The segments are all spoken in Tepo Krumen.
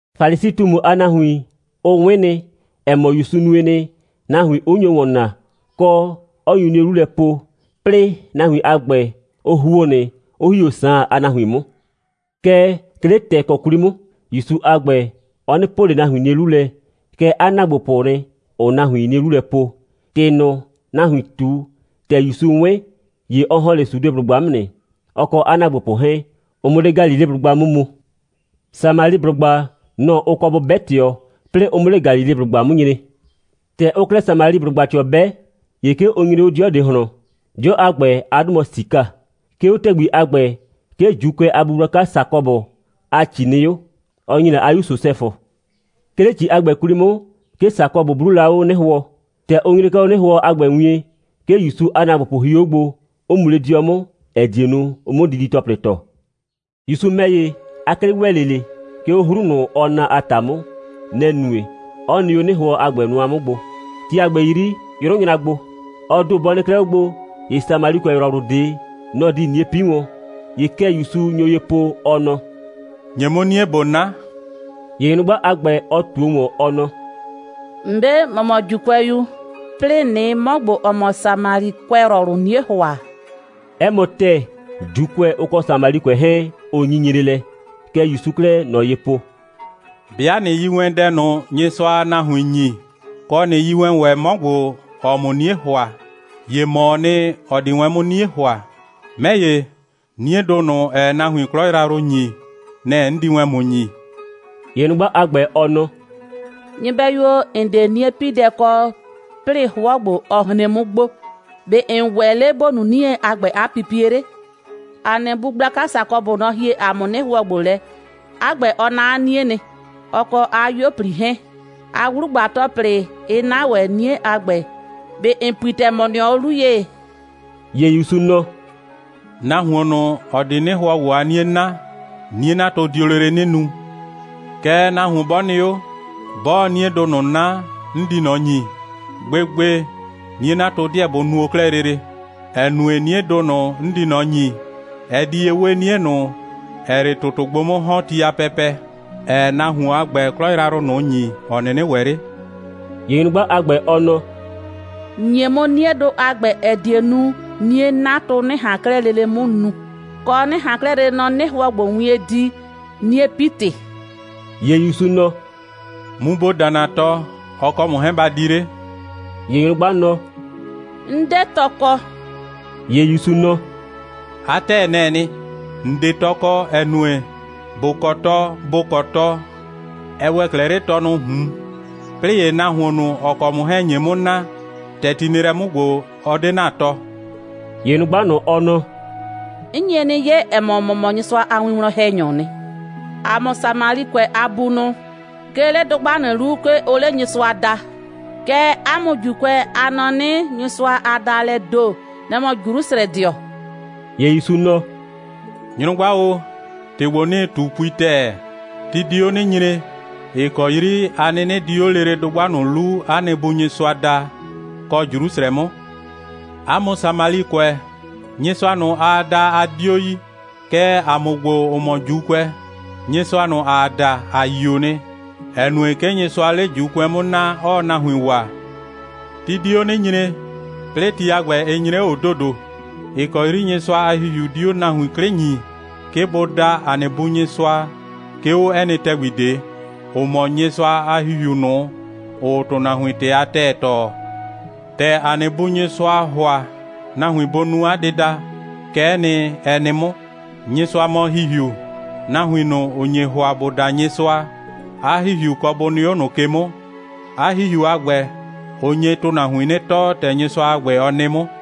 Falisi꞊tumu a nahuin, ʋ 'wɩn nɩ, ‑ɛ mɔ, ‑Yusu nue nɩ, nahuin 'ʋ nyo ‑wɔn naa, kɔ, 'ɔ nyu 'nie 'lu lɛ po, 'plɩɩ nahuin a ‑gbɛ, ʋ ‑huo nɩ, 'ʋ ‑hi 'o Saan a nahuin 'mʋ. Kɛɛ, 'ke 'le ‑tɛɛkɔ 'kwli 'mʋ, ‑Yusu a ‑gbɛ, ɔ 'nɩ po ꞊le nahuin 'nie 'lu lɛ, kɛɛ, 'a ‑naagbopʋʋ nɩ, ‑ʋʋ nahuin 'nie 'lu lɛ po. ‑Tɩ ꞊nʋ, nahuin ꞊tu, ‑tɛ ‑Yusu 'wɩn, ‑ye ɔ ‑hɔn 'le Sudeblʋgba 'mʋ nɩ, ɔ kɔ 'a ‑naagbopʋ 'hɛɛn, ʋ 'mʋ 'le Galileblʋgba 'mʋ mu. Samaliblʋgba, nɔ‑ ʋ kɔ bʋ 'bɛ ꞊tɩɔ, 'plɩɩ ʋ 'mʋ 'le Galileblʋgba 'mʋ nyre. ‑Tɛ ʋʋ 'klɛɛ Samaliblʋgba ꞊tɩɔ 'bɛ, ‑ye 'ke ʋ nyre 'o 'dɩɔ ꞊de ꞊hlɔn. 'Dɩɔ a ‑gbɛ, 'a 'dʋ mɔ Sika. 'Ke 'o ‑tɛgbi a ‑gbɛ, 'ke ‑Juukʋɛ a bu gblaka Sakɔbʋ a ‑ci nɩ 'o, ɔ ‑nyi la 'a 'yu Sosɛfʋ. 'Ke 'le ‑ci a ‑gbɛ 'kwli 'mʋ, 'ke Sakɔbʋ 'bluu la 'o 'nɩhʋɔ. ‑Tɛ ʋ nyre 'klɛɛ 'o 'nɩhʋɔ a ‑gbɛ wien, 'ke ‑Yusu a ‑naagbopʋ hio 'o gbo, 'ʋ mu 'le 'dɩɔ 'mʋ, ‑ɛ die nu, ʋ 'mʋ didi‑tɔplɩ ‑tɔ. ‑Yusu ‑mɛ ‑ye, 'a 'klɩ ‑wɛ 'le ꞊le, 'ke 'o 'hru ꞊nʋ, ʋʋ na a ‑ta 'mʋ. Nɛ‑ nue, 'ɔ nɩ 'o 'nɩhʋɔ a ‑gbɛ nʋa 'mʋ gbo. Ti a ‑gbɛ 'yri, 'yrʋ nyra gbo. Ɔ ‑do bɔ nɩ 'klɛɛ 'o gbo, ‑ye Samalikʋɛyrɔwlʋ ꞊de, nɔ‑ di 'nie 'pi wɔn. ‑Ye kɛ ‑Yusu nyo ye po, ɔ nɔ: «‑Nye 'mʋ 'nie, ꞊bo 'na!» ‑Ye nyrʋgba a ‑gbɛ, ɔ ꞊tuo ‑wɔn, ɔ nɔ: «‑Mbe', ‑mɔ mɔ ‑Juukʋɛyu, 'plɩɩ ꞊nɩɩ 'mɔ ‑gbo, ‑ɔ mɔ Samalikʋɛyrɔwlʋ 'nie ‑hʋa.» 'Ɛ mɔ ‑tɛɛ, ‑Juukʋɛ, ʋ kɔ Samalikʋɛ 'hɛɛn, ʋ nyinyre lɛ. Kɛ ‑Yusuu 'klɛɛ ꞊nɔ ye po: «'Bɩa ꞊nɩ yi wɛn dɛ ꞊nʋ, Nyɩsʋaa nahuin ‑nyi, kɔ, ꞊nɩ yi wɛn ‑wɛ 'mɔ ‑gbo, ‑ɔɔ ‑mʋ 'nie ‑hʋa, ‑ye ‑mɔɔ nɩ, ‑ɔ di wɛn 'mʋ 'nie ‑hʋa. 'Mɛ ‑ye, 'niedʋ ꞊nʋ, ‑ɛɛ nahuon 'klɔ yrayrʋ ‑nyi, nɛ‑ 'n di wɛn ‑mʋ ‑nyi.» ‑Ye nyrʋgba a ‑gbɛ, ɔ nɔ: «Nyɩbɛyu o, ‑n 'de 'nie'piidɛ ꞊de kɔ, 'plɩɩ ‑ye 'hʋɔ ‑gbo, ɔ hren 'mʋ gbo. ‑Be' ‑n ‑wɛ 'le ‑bo nu 'nie a ‑gbɛ a 'pipie 'le? ‑A nɩ bu gblaka Sakɔbʋ, nɔ‑ hie ‑a mʋ 'nɩhʋɔ ‑gbo lɛ. 'A ‑gbɛ, ɔ 'na 'a 'nie nɩ, ɔ kɔ 'a 'yuo꞊pli 'hɛɛn, 'a 'wlugba‑tɔplɩ 'ɩ 'na ‑wɛ 'nie a ‑gbɛ. ꞊Be ‑n pui ‑tɛɛ, ‑mɔ nɩɔ 'o 'lu ye?» ‑Ye ‑Yusu nɔ: «Nahuon ꞊nʋ, ‑ɔ di 'nɩhʋɔ ‑gbo a 'nie 'na, 'nie'natʋ dio lele 'nɩ nu. Kɛɛ, nahuon 'bɔ nɩ 'o, 'bɔɔ 'niedʋ ꞊nʋ 'na, 'n di ꞊nɔ ‑nyi, gbegbe, 'nie'natʋ 'deɛ bʋ nuo 'klɛɛ lele. ‑Ɛ nue, 'niedʋ ꞊nʋ, 'n di ꞊nɔ ‑nyi, ɛ di ye 'we 'nie ꞊nʋ, ‑ɛɛ 'le ‑tʋtʋ gbo 'mʋ ‑hɔn ti a pɛpɛ, ‑ɛɛ nahuon a ‑gbɛ 'klɔ yrayrʋ ꞊nʋ ‑nyi, ‑ɔ 'nɩnɩ ‑wɛ 'le.» ‑Ye nyrʋgba a ‑gbɛ, ɔ nɔ: «‑Nye 'mʋ 'niedʋ a ‑gbɛ, ‑ɛ die nu, 'nie'natʋ 'nɩ ꞊han 'klɛɛ lele 'mʋ nu, kɔ, 'nɩ ꞊han 'klɛɛ lele nɔ 'nɩhʋɔ ‑gbo wien di, 'nie'pi‑tɩ.» ‑Ye ‑Yusu nɔ: «Mu ‑bo da ‑na tɔ, ɔ kɔ ‑mʋ 'hɛɛn ba di 'le!» ‑Ye nyrʋgba nɔ: «'N 'de tɔ kɔ.» ‑Ye ‑Yusu nɔ: «'A ‑tɛɛ, nɛ‑ɛ nɩ. ‑N 'de tɔ kɔ, ‑ɛ nue, ‑bo kɔ tɔ, ‑bo kɔ tɔ, ɛ ‑wɛ 'klɛɛ 'le tɔnʋʋ ꞊hun, 'plɩɩ ‑ye, nahuon ꞊nʋ, ‑ɔ kɔ ‑mʋ 'hɛɛn‑ nye 'mʋ na, ‑tɛ ti nɩ lɛ 'mʋ ‑gbo, ɔ 'de ‑na tɔ.» ‑Ye nyrʋgba ꞊nʋ, ɔ nɔ: «'N nye 'nɩ 'ye, ‑ɛ mɔ, ‑mɔ mɔ Nyɩsʋa a winwlɔn‑hɛnyɔɔ nɩ. ‑A mʋ Samalikʋɛ a bunʋ, 'ke 'le dʋgba ꞊nʋ 'lu, 'ke ʋʋ 'le Nyɩsʋa daa, kɛɛ, 'a mʋ ‑Juukʋɛ, a nɔ 'nɩ, Nyɩsʋa a daalɛɛ ‑do, nɛ‑ mɔ Jrusrɛdɩɔ.» ‑Ye ‑Yusu nɔ: «Nyrʋgba o, ‑tɩ ‑gbo, 'nɩɩ ꞊tu, pui ‑tɛɛ. Ti di 'o 'nɩ nyre, ‑ɩ kɔ 'yri a 'nɩnɩ di 'o lele dʋgba ꞊nʋ 'lu ‑a nɩ Bu Nyɩsʋa daa, kɔ Jrusrɛ 'mʋ. 'A mʋ Samalikʋɛ, Nyɩsʋa ꞊nʋ, aa da, a 'dio yi. Kɛɛ, ‑a mʋ ‑gbo, ‑ʋ mɔ ‑Juukʋɛ, Nyɩsʋa ꞊nʋ, ‑aa da, ‑a yio nɩ, ‑ɛ nue, 'ke Nyɩsʋaa 'le ‑Juukʋɛ 'mʋ naa, 'ɔɔ nahuin waa. Ti di 'o 'nɩ nyre, 'plɩɩ ti a ‑gbɛ 'ɩ nyre 'o ‑dodo, ‑ɩ kɔ 'yri Nyɩsʋa a ‑Hihiu di 'o nahuin 'klɩ ‑nyii, 'ke bʋ da ‑a nɩ Bu Nyɩsʋa, 'ke 'o 'ɛ nɩ ‑tɛgbi ꞊de, ‑ʋ mɔ Nyɩsʋa a ‑Hihiu ꞊nʋ, ‑ʋʋ ‑tʋnahuin ‑tɩ a ‑tɛɛ tɔɔ. ‑Tɛ ‑a nɩ Bu Nyɩsʋaa ‑hʋa nahuin bʋ nu 'a dɩda, kɛ'ɛ nɩ, ɛ nɩ 'mʋ. Nyɩsʋa mɔ ‑Hihiu. Nahuin ꞊nʋ, ‑ʋ nye ‑hʋa, ‑bʋ da Nyɩsʋa, 'a ‑Hihiu kɔ bʋ nɩ 'o ꞊nʋ ke 'mʋ. 'A ‑Hihiu a ‑gbɛ, ʋ nye ‑tʋnahuin 'nɩ tɔɔ, ‑tɛ Nyɩsʋa a ‑gbɛ, ɔ nɩ 'mʋ.»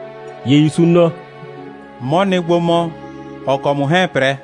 ‑Ye ‑Yusu nɔ: «'Mɔ nɩ gbo mɔ, ‑ɔ kɔ ‑mʋ 'hɛɛn‑ 'prɛ.»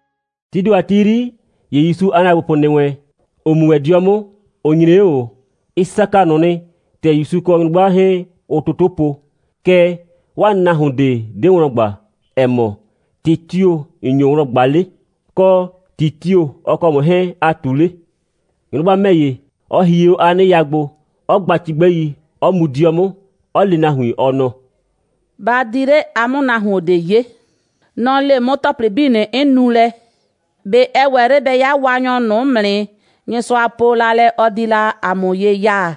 Tii ‑do a ti 'yri, ‑ye ‑Yusu a ‑naagbopʋ ‑nɩ wɛn, ‑ʋ mu wɛn 'dɩɔ 'mʋ, ʋ nyre 'o ꞊o. Ɩ saka ꞊nʋ nɩ, ‑tɛ ‑Yusu kɔ nyrʋgba 'hɛɛn, ʋʋ toto po. Kɛɛ, 'waa nahuon ꞊de 'de wlɔn ꞊gba, ‑ɛ mɔ: «‑Tɩ tio‑ ‑n nyo wlɔn ꞊gba 'le?» kɔ, «‑Tɩ tio‑ ɔ kɔ ‑mʋ 'hɛɛn, aa ꞊tu 'le?» Nyrʋgba ‑mɛ ‑ye, ɔ hie 'o 'a 'nɩya gbo, 'ɔ gba cigbɛi, 'ɔ mu 'dɩɔ 'mʋ, 'ɔ le nahuin, ɔ nɔ: «Ba di 'le, a 'mʋ nahuon ꞊de 'ye. Nɔ‑ le 'mʋ ‑tɔplɩ 'bii ꞊nʋ, 'n nu lɛ. ꞊Be ɛ ‑wɛ 'le bɛ 'ya Waanyɔ ꞊nʋ 'mʋ nɩ, Nyɩsʋa po la lɛ, ɔ di la ‑a mʋ ye ya?»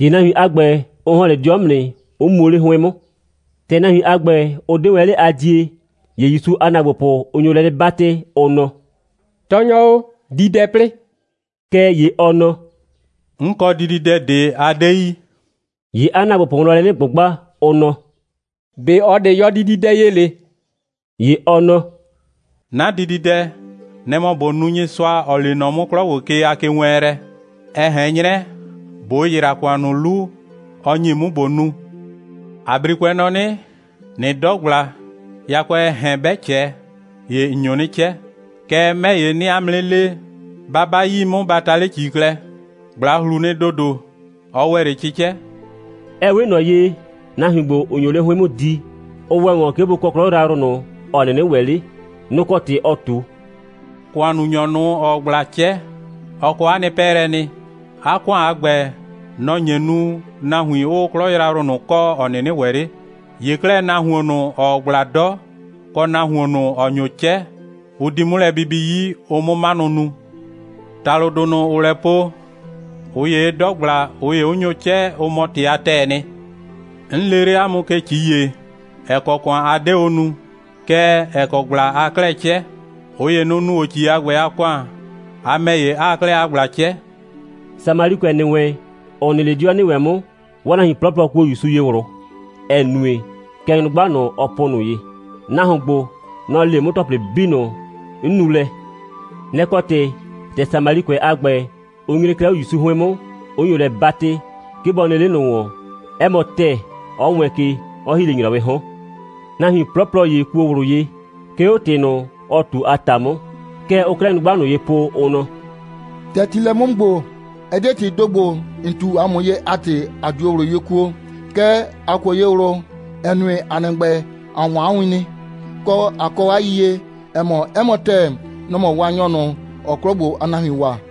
‑Ye nahuin a ‑gbɛ, ʋ ‑hɔn 'le 'dɩɔ 'mʋ nɩ, 'ʋ muo 'le 'hʋɩn 'mʋ. ‑Tɛ nahuin a ‑gbɛ, ʋ 'de wɛn 'le a die, ‑ye ‑Yusu a ‑naagbopʋ, ʋ nyo lɛ 'nɩ 'batɩ, ʋ nɔ: «Tɔɔnyɔ o, di dɛ 'plɩɩ.» Kɛɛ ‑ye ɔ nɔ: «'N kɔ dididɛ ꞊de, a 'de yi.» ‑Ye 'a ‑naagbopʋ wlɔn lɛ 'nɩ ꞊gbʋgba, ʋ nɔ: «꞊Be ꞊ɔ ꞊de yɔ dididɛ ye ‑le?» ‑Ye ɔ nɔ: «'Na dididɛ, nɛ‑ mɔ ꞊bo nu Nyɩsʋa, ‑ɔ lee nɔ 'mʋ 'klɔ ‑gbo ke a kewɛɛnlɛ, ɛ ꞊hɛn 'nyrɛ ꞊bo ‑yra ‑kʋan ꞊nʋ 'lu, ɔ ‑nyi 'mʋ, ꞊bo nu. ‑A 'brikʋɛ nɔ 'nɩ: ꞊Nɩ 'dɔ ꞊gbla, yakʋɛɛ ‑hɛn 'bɛ ꞊cɛ, ‑ye ‑n nyo 'nɩ 'cɛ. Kɛɛ, 'mɛ ‑ye, 'nɩɩ 'a mʋ 'nɩ le: Ba 'ba 'yii 'mʋ, ba ta 'le ‑ci klɛ. ꞊Gbla ꞊hlu nɩ ‑dodo. Ɔ ‑wɛ 'le 'cɩcɛ.» (Ɛ 'we ꞊nɔ ye, nahuin ‑gbo, ‑ʋ nyo 'le 'hʋɩn 'mʋ di, ‑ʋ ‑wɛ ‑wɔn, 'ke ‑bʋ kɔ 'klɔ yrayrʋ ꞊nʋ, ‑ɔ 'nɩnɩ ‑wɛ 'le, nʋ‑ kɔ ‑tɩ ɔɔ ꞊tu.) «‑Kʋannunyɔ ꞊nʋ, ‑ɔɔ ꞊gbla 'cɛ, ɔ kɔ 'a nɩ 'pɛɛlɛ nɩ. 'A ‑kʋan a ‑gbɛ, nɔ‑ nye nu, nahuin 'ʋʋ 'klɔ yrayrʋ ꞊nʋ kɔ, ‑ɔ 'nɩnɩ ‑wɛ 'le. ‑Ye 'klɛɛ, nahuon ꞊nʋ, ‑ɔɔ ꞊gbla 'dɔ, kɔ nahuon ꞊nʋ, ‑ɔ nyo 'cɛ, ʋ di 'mʋ lɛ bibi 'yi, ʋ 'mʋ 'manʋ nu. ‑Talʋdʋ ꞊nʋ, ‑ʋʋ lɛ po: ꞊Ʋ ‑yee 'dɔ ꞊gbla, ꞊ʋ ‑ye 'ʋ nyo 'cɛ, ʋ mɔ ‑tɩ a ‑tɛɛ nɩ. 'N lee 'le 'a mʋ ke ‑ci ‑ye, ‑ɛ kɔ ‑kʋan a 'de o nu, kɛɛ, ‑ɛ kɔ ꞊gbla aa 'klɛɛ 'cɛ. ꞊Ʋ ‑ye, nʋ‑ nu o ‑ci a ‑gbɛ a ‑kʋan, a ‑mɛ ‑ye, 'aa 'klɛɛ 'a ꞊gbla 'cɛ.» Samalikʋɛ ‑nɩ wɛn, ‑ʋ nɩ 'le 'dɩɔ ‑nɩ wɛn 'mʋ, 'waa nahuin 'plɔplɔ kuo ‑Yusu ye ꞊wlʋ, ‑ɛ nue, kɛ nyrʋgba ꞊nʋ, ɔ po ꞊nʋ ye: «Nahuon ‑gbo, nɔ‑ le 'mʋ ‑tɔplɩ 'bii ꞊nʋ, 'n nu lɛ.» Nɛ‑ kɔ ‑tɩ, ‑tɛ Samalikʋɛ a ‑gbɛ, ʋ nyre 'klɛɛ 'o ‑Yusu 'hʋɩn 'mʋ, 'ʋ nyo lɛ 'batɩ, 'ke bɔ nɩ 'le ꞊nʋ ‑wɔn, 'ɛ mɔ ‑tɛɛ, 'ɔ wɛɛn ke, 'ɔ ‑hi 'le ‑nyrɔwɩɩ 'hɔn. Nahuin 'plɔplɔ ‑ye kuo ꞊wlʋ ye, 'ke 'o ‑tɩ ꞊nʋ, ɔ ꞊tu a ‑ta 'mʋ. Kɛ ʋʋ 'klɛɛ nyrʋgba ꞊nʋ ye po, ʋ nɔ: «‑Tɛ ti nɩ lɛ 'mʋ ‑gbo, ɛ 'de ‑tɩɩ ‑do ‑gbo, ‑n ꞊tu ‑a mʋ ye a ‑tɩ, ‑a 'dio ꞊wlʋ ye kuo, kɛɛ, ‑a kuo ye ꞊wlʋ, ‑ɛ nue, ‑a nɩ ‑gbɛ, ‑a 'wɔn 'a win nɩ, kɔ, ‑a kɔ 'a yiyie, ‑ɛ mɔ, 'ɛ mɔ ‑tɛɛ, nɔ‑ mɔ Waanyɔ ꞊nʋ, ‑ɔɔ 'klɔ ‑gbo a nahuin waa.»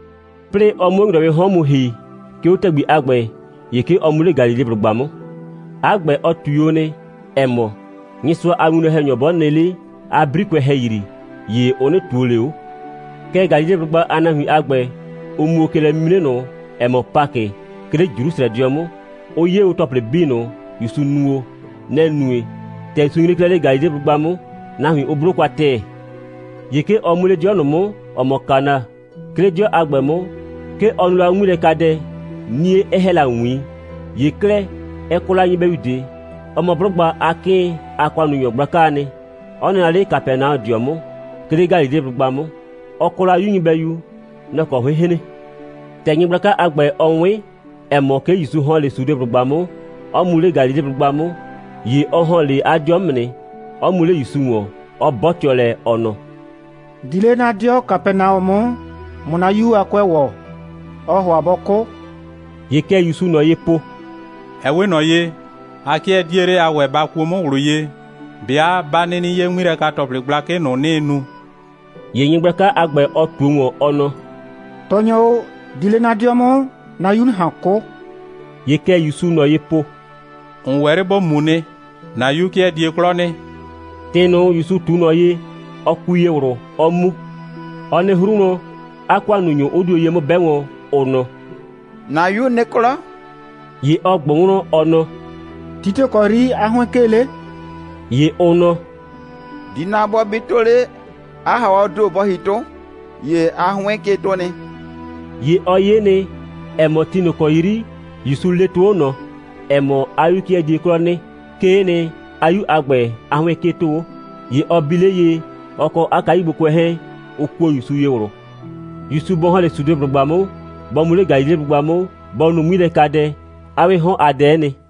'Plɩɩ ɔ 'mʋ 'o ‑nyrɔwɩɩ 'hɔn mu ‑hi, 'ke 'o ‑tɛgbi a ‑gbɛ, ‑ye 'ke ɔ mu 'le Galileblʋgba 'mʋ. 'A ‑gbɛ, ɔ ꞊tui o nɩ, ‑ɛ mɔ: «Nyɩsʋa a winwlɔn‑hɛnyɔ 'bɔ nɩ 'le 'a 'brikʋɛ ‑hɛyri, ‑ye ʋ 'nɩ ꞊tuo ꞊le 'o.» Kɛɛ, Galileblʋgba a nahuin a ‑gbɛ, ʋ mu o ke lɛ'mimre ꞊nʋ, ‑ɛ mɔ Pakɩ, 'ke 'le Jrusrɛdɩɔ 'mʋ, 'ʋ 'ye o ‑tɔplɩ 'bii ꞊nʋ, ‑Yusu nu o. Nɛ‑ nue, ‑tɛ ‑Yusu nyre 'klɛɛ 'le Galileblʋgba 'mʋ, nahuin 'ʋ 'blo kwa ‑tɛɛ. ‑Ye 'ke ɔ mu 'le 'dɩɔ ꞊nʋ 'mʋ, ‑ɔ mɔ Kana. 'Ke 'le 'dɩɔ a ‑gbɛ 'mʋ, 'ke ɔ nuu la 'o 'ŋmilɛkadɛ, 'nie 'ɛ ‑hɛ la ‑wiin. ‑Ye 'klɛɛ, ɛ kɔ la nyɩbɛyu ꞊de. Ɔ mɔ 'blʋgba a 'kɩɩn a ‑kʋannunyɔ gblakaa nɩ, 'ɔ nɩ la 'le Kapɛnaɔdɩɔ 'mʋ, 'ke 'le Galileblʋgba 'mʋ. Ɔ kɔ la 'yu nyɩbɛyu. Nɔ‑ kɔ 'hʋɩɩn‑ hren. ‑Tɛ nyɩgblaka a ‑gbɛ, ɔ 'wɩn, ‑ɛ mɔ, 'ke ‑Yusu ‑hɔn 'le Sudeblʋgba 'mʋ, 'ɔ mu 'le Galileblʋgba 'mʋ, ‑ye ɔ ‑hɔn 'le 'a 'dɩɔ 'mʋ nɩ, 'ɔ mu 'le ‑Yusu ‑wɔn, 'ɔ 'bɔtɩɔ lɛ, ɔ nɔ: «Di 'le 'na 'dɩɔ Kapɛnaɔ 'mʋ, ꞊mʋ 'na 'yu a 'kʋɛ ‑wɔ. Ɔɔ ‑hʋa bɔ 'kʋ.» ‑Ye kɛ ‑Yusuu ꞊nɔ ye po: «Ɛ 'we ꞊nɔ ye, a 'kɩɛ 'die 'le a ‑wɛɛ ba kuo 'mʋ ꞊wlʋ ye, 'bɩa 'ba 'nɩnɩ 'ye 'ŋmilɛka‑tɔplɩ gblakɩ ꞊nʋ, 'nɩɩ nu.» ‑Ye nyɩgblaka a ‑gbɛ, ɔ ꞊tuo ‑wɔn, ɔ nɔ: «Tɔɔnyɔ o, di 'le 'na 'dɩɔ 'mʋ, 'na 'yu 'nɩ ꞊han 'kʋ.» ‑Ye kɛ ‑Yusuu ꞊nɔ ye po: «‑N ‑wɛ 'le ‑bo mu nɩ. ‑Na 'yu 'kɩɛ die 'klɔ nɩ.» ‑Tɩ ꞊nʋ, ‑Yusu ꞊tu ꞊nɔ ye, ɔ kui ye ꞊wlʋ, 'ɔ mu. Ɔ nɩ 'hru wlɔn, 'a ‑kʋannunyʋ 'ʋ dio ye 'mʋ 'bɛ wɔn, ʋ nɔ: «‑Na 'yu nɩ 'klɔ.» ‑Ye ɔ ꞊gbʋ wlɔn, ɔ nɔ: «Ti tio‑ kɔ 'yri 'a 'hʋɩn 'kee 'le?» ‑Ye ʋ nɔ: «‑Dina bɔ bi 'tʋ 'le, 'a ‑haawɔɔ ‑do bɔ ‑hi 'tʋ, ‑ye 'a 'hʋɩn 'kee 'tʋ nɩ.» ‑Ye ɔ 'ye nɩ, ‑ɛ mɔ, ti ꞊nʋ ‑kɔ 'yri ‑Yusu lee 'tʋ 'o ꞊nɔ, ‑ɛ mɔ, 'a 'yu 'kɩɛ die 'klɔ nɩ, 'kee nɩ, 'a 'yu a ‑gbɛ a 'hʋɩn 'kee 'tʋ 'o. ‑Ye ɔ bi 'le ye, ɔ kɔ 'a kayugbokʋɛ 'hɛɛn, ʋ kuo ‑Yusu ye ꞊wlʋ. ‑Yusu bɔ ‑hɔn 'le Sudeblʋgba 'mʋ, bɔ mu 'le Galileblʋgba 'mʋ, bɔ nu 'ŋmilɛkadɛ, 'a 'wɩɩ 'hɔn a dɛ'ɛ nɩ.